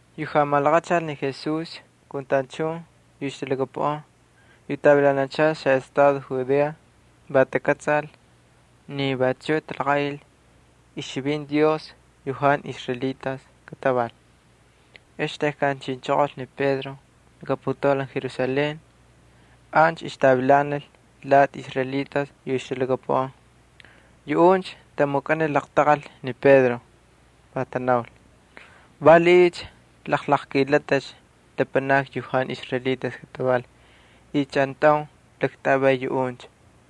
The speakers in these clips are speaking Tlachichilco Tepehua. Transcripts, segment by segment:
Yu jalaqmalaqachal ni Jesús kun tachun yu ixtalhakapuꞌan yu ixtavilanachal xaꞌestado Judea va takꞌatsal ni vachuꞌ talaqaꞌil ixchivinti Dios yu jantu israelitas kataval. Ex tejkan chinchoqol ni Pedro laka putaulan Jerusalén ancha ixtavilanal lati israelitas yu talhakapuꞌan. Yuꞌuncha tamukꞌanil laqtaqal ni Pedro. Va tanaul: —¿Valiꞌiycha jalaqkꞌilatꞌicha lapanakni yu jantu israelitas kataval y chꞌantaun jalaktꞌavay yuꞌuncha?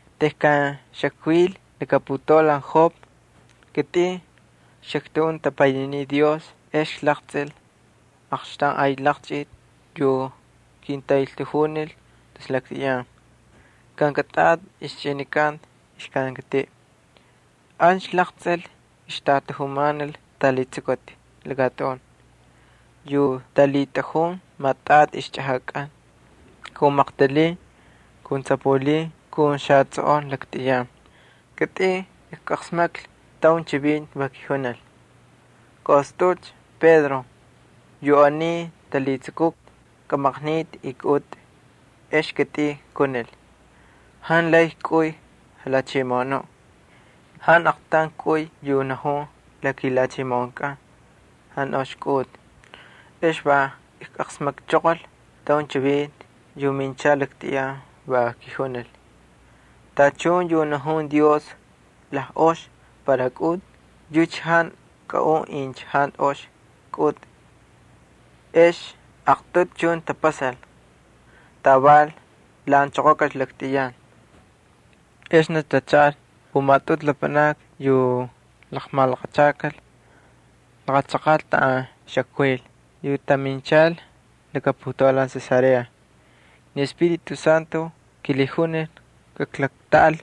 —Tejkan xakvil laka putaulan Jope kitꞌin xaktꞌajun tapaynininiꞌ Dios ex klaqtsꞌil aqxtaun ay laqchꞌiti yu kintaꞌeltajunil tus laktꞌiyan. Kankatꞌati ixchꞌinikanta ixkankatiꞌ. Ancha klaqtsꞌil ixtatajumanal xatalhitsukuti lakatꞌun yu talhitꞌajun maꞌatꞌati ixchꞌajakꞌan, ali maqtalin ali tsapulin ali xatsꞌoꞌon laktꞌiyan. Kitꞌin ijqasmaklhi taun chivinti, va kijunil: “Kaꞌostꞌaꞌulcha, Pedro, yu aniy talhitsukuti kamaqnitꞌi y kꞌaꞌutꞌi.” Ex kitꞌin kunil: “Jantu lay kꞌuy, Jalhachimoꞌonuꞌ. Jantu aqtaun kꞌuy yu najun la kilhachimoꞌonkꞌan jantu ox kꞌaꞌutꞌi.” Ex va ijqasmakchoqol ataun chivinti yu minchal laktꞌiyan, va kijunil: “Tachun yu najun Dios lajꞌox para kꞌaꞌutꞌi yucha jantu kꞌaꞌun incha jantu ox kꞌaꞌutꞌi.” Ex aqtꞌutu chuncha tapasal. Taval lhaꞌanchoqokalcha laktꞌiyan. Exnicha tachaꞌal pumatꞌutu lapanakni yu laqmalaqachakal laqa chaqaꞌ taꞌan xakvil yu taminchal laka putaulan Cesarea. Ni Espíritu Santo kilhijunil kaklaktꞌaꞌal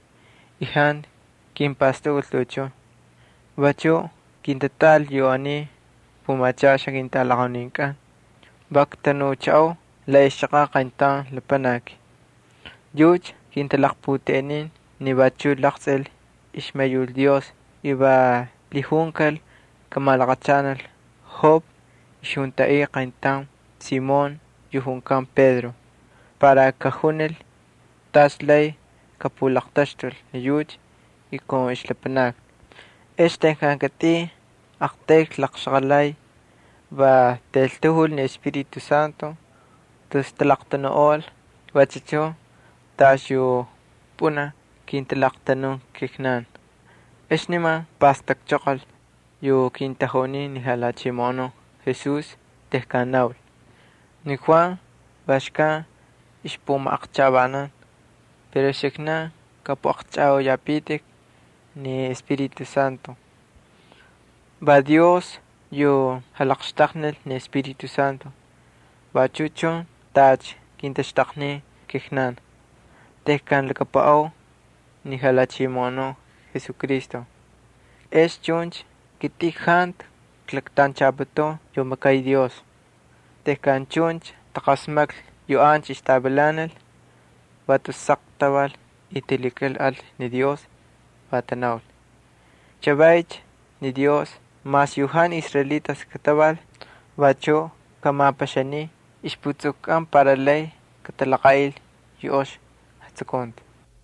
y jantu kimpastakꞌul tuꞌuchun. Vachuꞌ kintatꞌaꞌal yu aniy pumachaxan ketꞌalaqauninkꞌan. Va ktanuchaꞌau la ixchaqaꞌ qayntaun lapanaki. Yucha kintalaqputeꞌenin ni vachuꞌ laqtsꞌil ixmayul Dios y va lhijunkal kamalaqachanal Jope ixjuntaꞌika qayntaun Simón yu junkan Pedro para kajunil tas lay kapulaqtaxtul ni yucha kun ixlapanakni. Ex tejkan kitꞌin kꞌaqtayl klaqxaqalay, va taꞌeltajul ni Espíritu Santo, tus talaqtanuꞌol vachu chun tacha yu pꞌunaj kintalaqtanun kijnan. Ex niman kpastakchoqol yu kintajunin ni Jalhachimoꞌonuꞌ Jesús tejkan naul: “Ni Juan va xkan ixpumaqchajꞌavanan pero uxiknan kꞌapꞌuꞌaqchꞌajꞌauyapitik ni Espíritu Santo.” Va Dios yu jalaqxtaqnil ni Espíritu Santo vachu chun tacha kintaxtaqnin kijnan tejkan lhakapuꞌau ni Jalhachimoꞌonuꞌ Jesucristo. Ex chuncha kitꞌin jantu klaktanchaputun yu makay Dios. Tejkan chuncha taqasmaklhi yu ancha ixtavilanal va tus saq taval y ay tamakal ni Dios, va tanaul: —Chavaycha ni Dios mas yu jantu israelitas kataval vachuꞌ jamapaxaniy ixjatapastakꞌatkꞌan para lay katalaqaꞌil yu ox jatsukunti.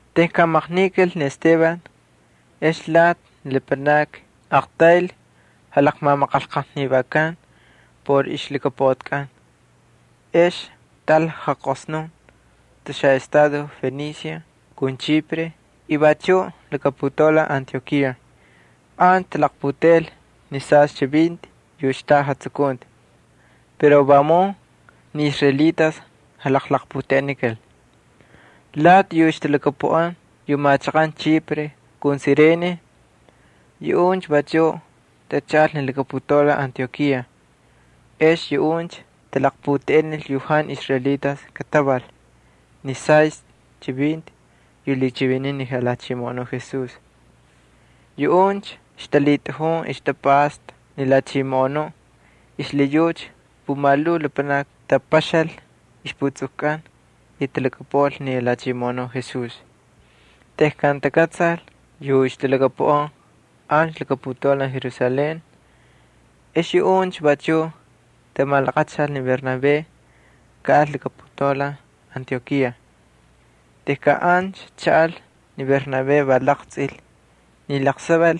Tejkan maqnikal ni Esteban ex lati ni lapanakni aqtayl jalaqmamaqanlqajnivakan por ixlhakapuꞌatikꞌan. Ex taꞌal jaqosnun tus xaꞌestado Fenicia kun Chipre y vachuꞌ laka putaulan Antiokía. Ancha talaqputeꞌel ni sastꞌi chivinti yu xtaꞌa jatsukunti, pero vamun ni israelitas jalaqputeꞌenikal. Lati yu ixtalhakapuꞌan yu machaqan Chipre kun Sirene yuꞌuncha vachuꞌ tachaꞌal ni laka putaulan Antiokía. Ex yuꞌuncha talaqputeꞌenil yu jantu israelitas kataval ni sastꞌi chivinti yu lhichiviniy ni Jalhachimoꞌonuꞌ Jesús. Yuꞌuncha ixtalhitꞌajun ixtapꞌasta ni Jalhachimoꞌonuꞌ, xlhiyucha pumalhuu lapanakni tapaxal ixputsukukꞌan, y talhakapuꞌal ni Jalhachimoꞌonuꞌ Jesús. Tejkan takꞌatsal yu ixtalhakapuꞌan ancha laka putaulan Jerusalén, ex yuꞌuncha vachuꞌ tamalaqachal ni Bernabé kaꞌal laka putaulan Antiokía. Tejkan ancha chaꞌal ni Bernabé va laqtsꞌil ni laqsaval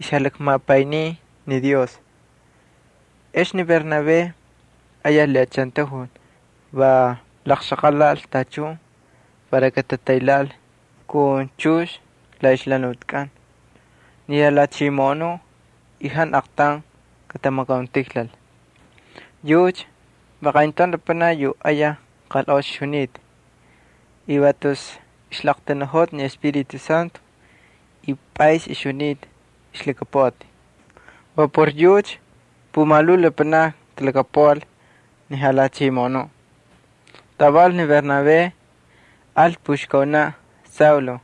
ixjalakmapayniy ni Dios. Ex ni Bernabé ayaj lhiꞌachantajul va laqxaqalal tachun para katataylhaꞌal kun chux la ixjalhanutikꞌan ni Jalhachimoꞌonuꞌ y jantu aqtaun katamakauntijlal. Yucha va qayntaun lapanaki yu ayaj qalꞌox ixjunita. Va tus ixlaqtanuꞌol ni Espíritu Santo, y pꞌays ixjunita ixlhakapuꞌati. Va por yucha pumalhuu lapanakni talhakapuꞌal ni Jalhachimoꞌonuꞌ. Taval ni Bernabé al puxkaunaꞌ Saulo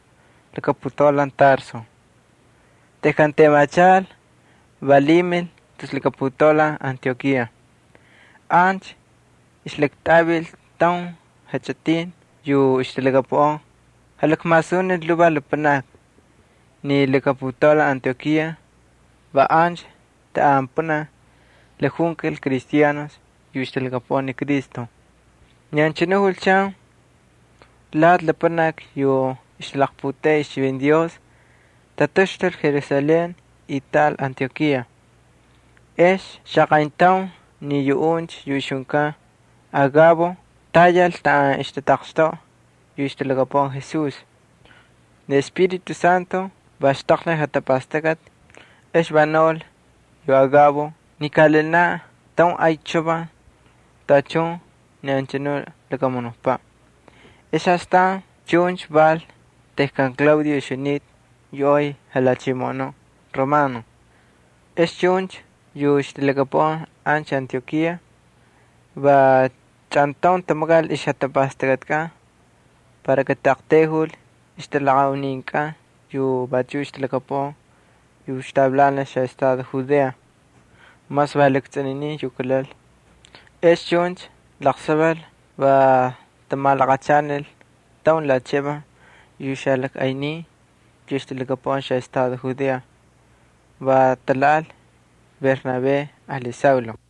laka putaulan Tarso. Tejkan temachal va lhimil tus laka putaulan Antiokía. Ancha ixlaktꞌavil taun jachꞌitin yu ixtalhakapuꞌan, jalakmasunil lhuvaj lapanakni. Ni laka putaulan Antiokía va ancha taꞌan pꞌunaj lakjunkal Cristianos yu ixtalhakapuꞌan ni Cristo. Ni anchanu julchan, lati lapanakni yu ixtalaqputeꞌey ixchivinti Dios tataxtulcha Jerusalén y taꞌal Antiokía. Ex xaqayntaun ni yuꞌuncha yu ixjunkan Agabo tayal taꞌan ixtataqxtoꞌa yu ixtalhakapuꞌan Jesús. Ni Espíritu Santo va xtaqnil jatapastakꞌati, ex va naul yu Agabo ni kaꞌalinaꞌ taun ay chavan tachun ni anchanuꞌ lakamunukpaꞌ. Astan chuncha val tejkan Claudio ixjunita yu ay jalhachimoꞌonuꞌ Romano. Ex chuncha yu ixtalhakapuꞌan ancha Antiokía va chꞌantaun tamakal ixjatapastakꞌatikꞌan para kataꞌaqtayjul ixtꞌalaqauninkꞌan yu vachuꞌ ixtalhakapuꞌan yu ixtavilanal xaꞌestado Judea, mas va lakstsꞌuninin yu kalal. Ex chuncha laqsaval va tamalaqachanil taun limosnaj yu xalajꞌaynin yu ixtalhakapuꞌan xaꞌestado Judea. Va talhaꞌal Bernabé ali Saulo.